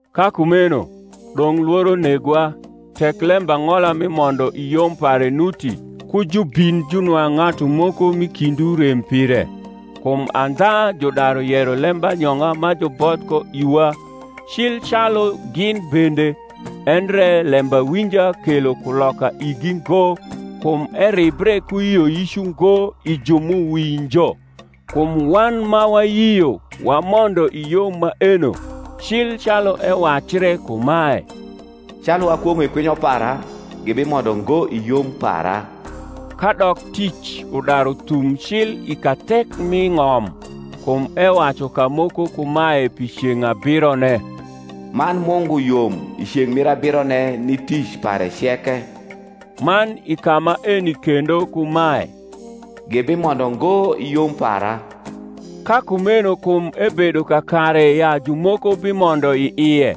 Ka kumeno, dong’ lworo negwa, tek lembang’ola mi mondo i yom pare nuti ku jubin junwang’ ng’atu moko m’i kindwu rem pire. Kum andha judaru yero lembanyong’a ma juboth ko iwa, cil calu gin bende: endre lembawinja kelo kuloka igi ngo, kum eribre ku yioyic ungo i ju m’uwinjo. Kum wan ma wayio wamondo i yom maeno; cil calu ewacre kumae, Calu akwong’o i kwinyo para, Gibimondo ngo i yom para: kadok tic udaru thum cil i kathek mi ng’om. Kum ewacu kamoko kumae pi ceng’ abirone, Man Mungu yom i ceng’ mir abirone ni tic pare ceke; man i ka maeni kendo kumae, Gibimondo ngo i yom para. Ka kumeno kum ebedo kakare ya jumoko bimondo i ie,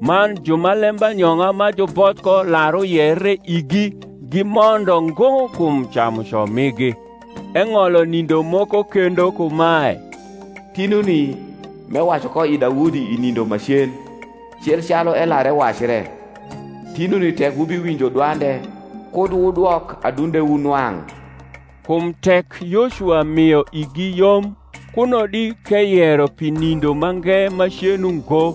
man ju ma lembanyong’a ma juboth ko lar uyere igi gimondo ngo kum camuco migi, eng’olo nindo moko kendo kumae, Tinuni, m’ewacu ko i Daudi i nindo ma cen (cil calu elar ewacre), Tinuni tek wubiwinjo dwande, Kud wudwok adundewu nwang’. Kum tek Yocuwa mio igi yom, kuno di k’eyero pi nindo mange macen ungo.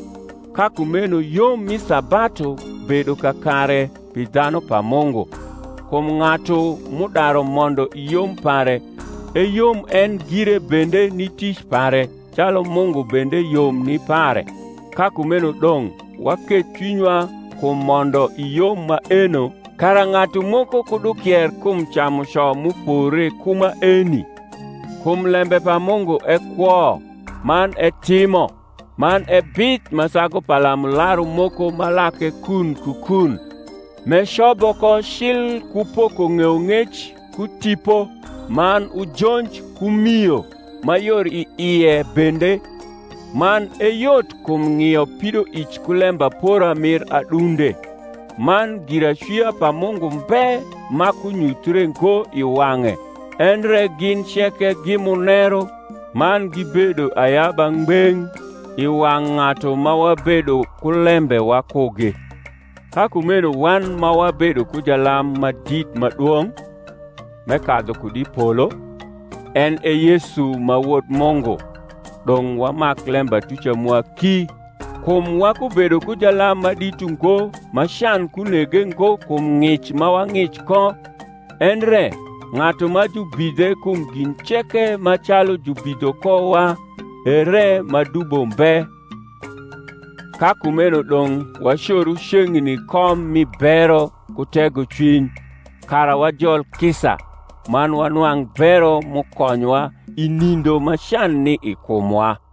Ka kumeno yom mi sabatu bedo kakare pi dhanu pa Mungu. Kum ng’atu m’udaru mondo i yom pare eyom en gire bende ni tic pare, calu Mungu bende yom ni pare. Ka kumeno dong’ waketh cwinywa kum mondo i yom maeno, kara ng’atu moko kud ukier kum camuco m’upore ku maeni. Kum lembe pa Mungu e kwo, man etimo, man e bith ma sagu palamularu moko ma lake kun ku kun, m’ecobo ko cil ku poko ng’eyong’ec ku tipo, man ujonj ku mio ma yor i ie bende, man e yot kum ng’io pidoic ku lembapora mir adunde. Man giracwia pa Mungu mbe ma kunyuthre ngo i wang’e: endre gin ceke gi muneru man gibedo ayaba ngbeng’ i wang’ ng’atu ma wabedo ku lembe wakugi. Ka kumeno wan ma wabedo ku jalam ma dit ma dwong’, m’ekadhu kud i polo, en e Yesu ma Wod Mungu, dong’ wamak lembatuca mwa ki. Kum wakubedo ku jalam ma dit ungo ma can kunege ngo kum ng’ic ma wa ng’ic ko; endre ng’atu ma jubidhe kum gin ceke ma calu jubidho kowa, ere ma dubo mbe. Ka kumeno dong’ wacoru ceng’ni kom mi bero ku tegocwiny, kara wajol kisa, man wanwang’ bero m’ukonywa i nindo ma can ni i kumwa.